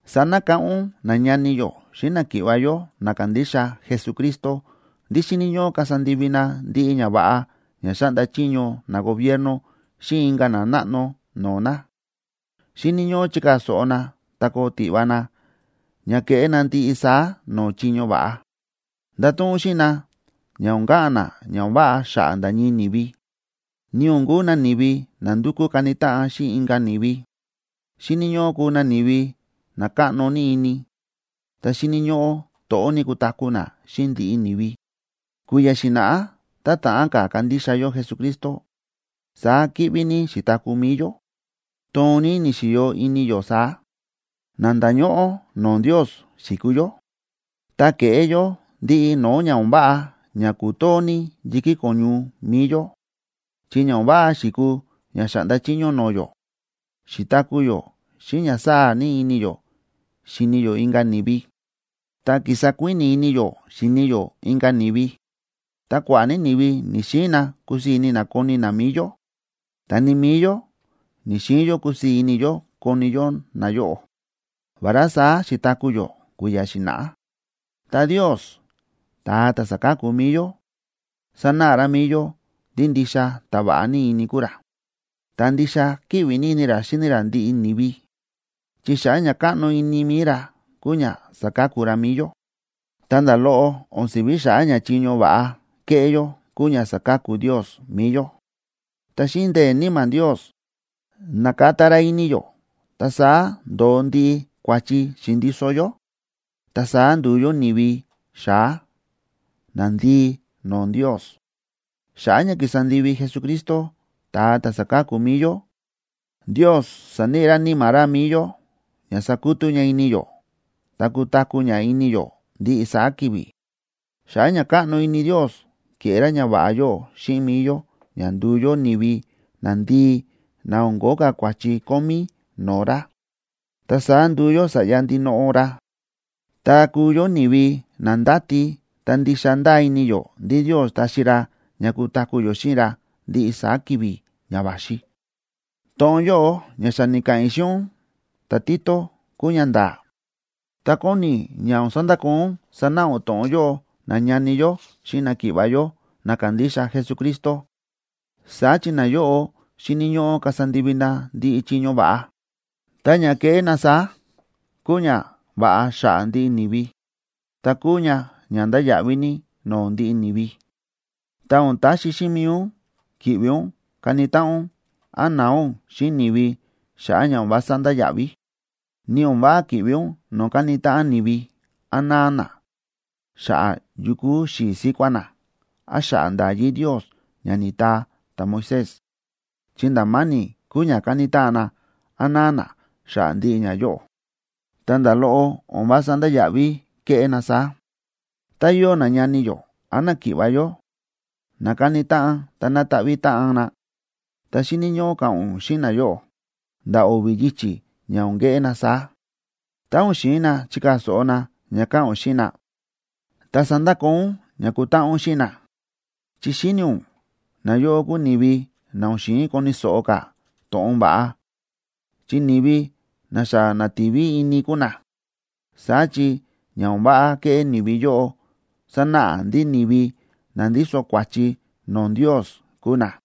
Sanakáꞌán ún nañani yó xíꞌin náki̱ꞌva̱ yó na kándixa Jesucristo ndí xíni̱ ñóꞌó kasa ndivi na ndiꞌi ñava̱ꞌa ña xáꞌnda chiño nagobierno xíꞌin inka̱ nanáꞌno no̱o̱ na. Xíni̱ ñóꞌó chikaa̱ so̱ꞌo na, ta koo tiꞌva na ña keꞌé na ndiꞌi saá no̱o̱ chiño va̱ꞌa. Ndato̱ꞌon ún xíꞌin na ña o̱n ka̱ꞌa̱n na ña o̱n váꞌa xa̱ꞌa̱ nda̱ ñii ni̱vi, ni o̱n kuu na ni̱vi na ndúkú kani táꞌan xíꞌin inka̱ ni̱vi. Xíni̱ ñóꞌó kuu na ni̱vi na káꞌno ní ini, ta xíni̱ ñóꞌó to̱ꞌó ní kutaku̱ na xíꞌin ndiꞌi ni̱vi. Kui̱ya̱ xi̱na̱ꞌá tá o̱n ta̱ꞌán ka̱ kandixa yó Jesucristo, saá kíꞌví ní xi̱taku̱ mi̱i yó, toon ní ni̱xi̱yo ini yó saá, na nda̱ñóꞌó no̱o̱ Ndios xi̱kuu yó, ta ke̱ꞌé yó ndiꞌi no̱o̱ ña o̱n váꞌa ña ku̱too ní yi̱kí ko̱ñu mi̱i yó, chi ña o̱n váꞌa xi̱kuu ña xa̱ꞌnda chiño no̱o̱ yó. Xi̱taku̱ yó xíꞌin ña sáa̱ ní ini yó xíni yó inka̱ ni̱vi, ta ki̱sa kuíni̱ ini yó xíni yó inka̱ ni̱vi. Ta kua̱ꞌa̱ ní ni̱vi ni̱‑xiin na kusii̱ ini na koni na mi̱i yó, ta ni mi̱i yó ni̱‑xiin yó kusii̱ ini yó koni yó nayóꞌo. Vará saá xi̱taku̱ yó kui̱ya̱ xi̱na̱ꞌá, ta Ndios, ta̱a ta̱ sáka̱ku mi̱i yó, sa̱náꞌa ra mi̱i yó ndí ndixa ta̱ váꞌa ní ini kúu ra, ta ndixa kíꞌvi ní ini ra xíni ra ndiꞌi ni̱vi, chi xa̱ꞌa̱ ña káꞌno ini mi̱i ra kúu ña sa̱ka̱ku ra mi̱i yó. Ta nda̱ loꞌo o̱n si̱ví xa̱ꞌa̱ ña chiño va̱ꞌa ke̱ꞌé yó kúu ña sa̱ka̱ku Ndios mi̱i yó. Ta xíꞌin ndee̱ Níma̱ Ndios, na̱kata ra ini yó ta saá ndo̱o ndiꞌi kua̱chi xi̱ndiso yó, ta saá ndu̱u yó ni̱vi xa̱á, nandii no̱o̱ Ndios. Xa̱ꞌa̱ ña ki̱sa ndivi Jesucristo, ta̱a ta̱ sa̱ka̱ku mi̱i yó, Ndios sa̱níꞌi ra Níma̱ ra mi̱i yó ña sakutú ña ini yó ta kutaku̱ ña ini yó ndiꞌi saá ki̱vi̱. Xa̱ꞌa̱ ña káꞌno ini Ndios, ke̱ꞌé ra ñava̱ꞌa yóꞌo xíꞌin mi̱i yó ña ndu̱u yó ni̱vi nandii na o̱n ko̱ó ka̱ kua̱chi kómí no̱o̱ ra. Ta saá ndu̱u yó sa̱ꞌya ndinoꞌo ra, ta kúu yó ni̱vi na ndáti ta ndixa ndáa ini yó ndí Ndios taxi ra ña kutaku̱ yó xíꞌin ra ndiꞌi saá ki̱vi̱ ña va̱xi. To̱ꞌon yóꞌo ña xa ni̱ka̱ꞌa̱n i̱ xíꞌin ún ta̱Tito kúu ñanda̱a̱, ta kóni i̱ ña o̱n sandakoo ún sánáꞌa ún to̱ꞌon yóꞌo nañani yó xíꞌin náki̱ꞌva̱ yó na kándixa Jesucristo. Saá chi nayóꞌo xíni̱ ñóꞌó kasa ndivi na ndiꞌi chiño va̱ꞌa. Ta ña kéꞌé na saá kúu ñava̱ꞌa xa̱ꞌa̱ ndiꞌi ni̱vi, ta kúu ña ña ndáya̱ꞌví ní no̱o̱ ndiꞌi ni̱vi. Ta o̱n taxi xíꞌin mi̱i ún ki̱ꞌvi ún kani táꞌan ún, án na̱a ún xíꞌin ni̱vi xa̱ꞌa̱ ña o̱n vása ndáya̱ꞌví, ni o̱n váꞌa ki̱ꞌvi ún no̱o̱ káni táꞌan ni̱vi, án náa na xa̱ꞌa̱ yu kúu xi̱i̱ síkuá na, án xa̱ꞌa̱ nda̱yí Ndios ña ni̱taa ta̱Moisés, chi nda̱ ma̱ni̱ kúu ña kani táꞌan na án na̱a na xa̱ꞌa̱ ndiꞌi ñayóꞌo, ta nda̱ loꞌo o̱n vása ndáya̱ꞌví keꞌé na saá. Tá yóo nañani yó án náki̱ꞌva̱ yó na káni táꞌan ta nátaꞌví táꞌan na, ta xíni̱ ñóꞌó ka̱ꞌa̱n ún xíꞌin nayóꞌo nda̱ o̱vi̱ yichi̱ ña o̱n keꞌé na saá. Tá o̱n xi̱in na chikaa̱ so̱ꞌo na ña káꞌa̱n ún xíꞌin na, ta sandakoo ún ña kútáꞌan ún xíꞌin na. Chi xíni̱ ún nayóꞌo kúu ni̱vi na o̱n xi̱in koni̱ so̱ꞌo ka̱ to̱ꞌon va̱ꞌa, chi ni̱vi na xa na̱ti̱vi ini kúu na. Saá chi ña o̱n váꞌa kéꞌé ni̱vi yóꞌo sánáꞌa ndí ni̱vi na ndíso kua̱chi no̱o̱ Ndios kúu na.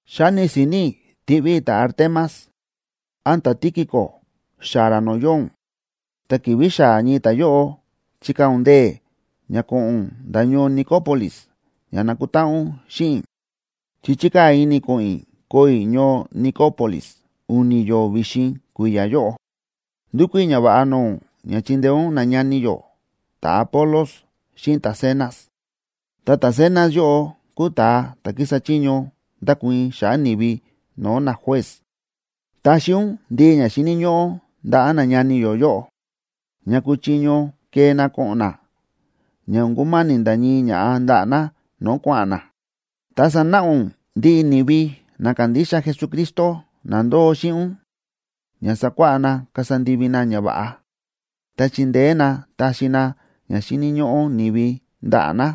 Xáni si̱ni̱ i̱ tiꞌví i̱ ta̱Artemas án ta̱Tíquico xaa̱ ra no̱o̱ yóo ún, ta ki̱vi̱ xaa̱ ñii ta̱yóꞌo, chikaa̱ ún ndee̱ ña ko̱ꞌo̱n ún nda̱ ñoo Nicópolis ña nakutáꞌan ún xíꞌin i̱, chi chi̱kaa̱ ini i̱ ko̱ꞌo̱n i̱ koo i̱ ñoo Nicópolis u̱ni̱ yo̱o̱ vi̱xin kui̱ya̱ yóꞌo. Ndúkú i̱ ñava̱ꞌa no̱o̱ ún ña chindeé ún nañani yó ta̱Apolos xíꞌin ta̱Zenas. Ta ta̱Zenas yóꞌo kúu ta̱a ta̱ kísa chiño ndákuii̱n xa̱ꞌa̱ ni̱vi no̱o̱ najuez. Taxi ún ndiꞌi ña xíni̱ ñóꞌó ndaꞌa̱ nañani yó yóꞌo, ña kuchiño kee na ko̱ꞌo̱n na, ña o̱n kuma̱ni̱ nda̱ ñii ñaꞌa̱ ndaꞌa̱ na no̱o̱ kua̱ꞌa̱n na. Ta sanáꞌa ún ndiꞌi ni̱vi na kándixa Jesucristo na ndóo xíꞌin ún ña sakuáꞌá na kasa ndivi na ñava̱ꞌa, ta chindeé na taxi na ña xíni̱ ñóꞌó ni̱vi ndaꞌa̱ na.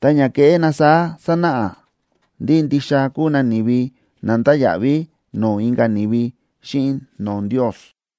Ta ña kéꞌé na saá sanáꞌa ndí ndixa kúu na ni̱vi na ndáya̱ꞌví no̱o̱ inka̱ ni̱vi xíꞌin no̱o̱ Ndios.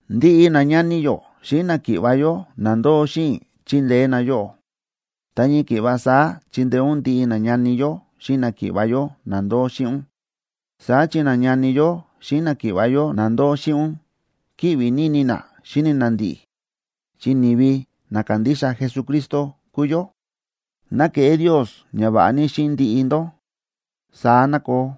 Ndiꞌi nañani yó xíꞌin náki̱ꞌva̱ yó na ndóo xíꞌin i̱ chíndeé na yóꞌó. Ta ñii ki̱ꞌva saá chindeé ún ndiꞌi nañani yó xíꞌin náki̱ꞌva̱ yó na ndóo xíꞌin ún. Saá chi nañani yó xíꞌin náki̱ꞌva̱ yó na ndóo xíꞌin ún kíꞌvi ní ini na xíni na ndi̱ꞌi̱, chi ni̱vi na kándixa Jesucristo kúu yó. Ná keꞌé Ndios ñava̱ꞌa ní xíꞌin ndiꞌi ndó. Saá ná koo.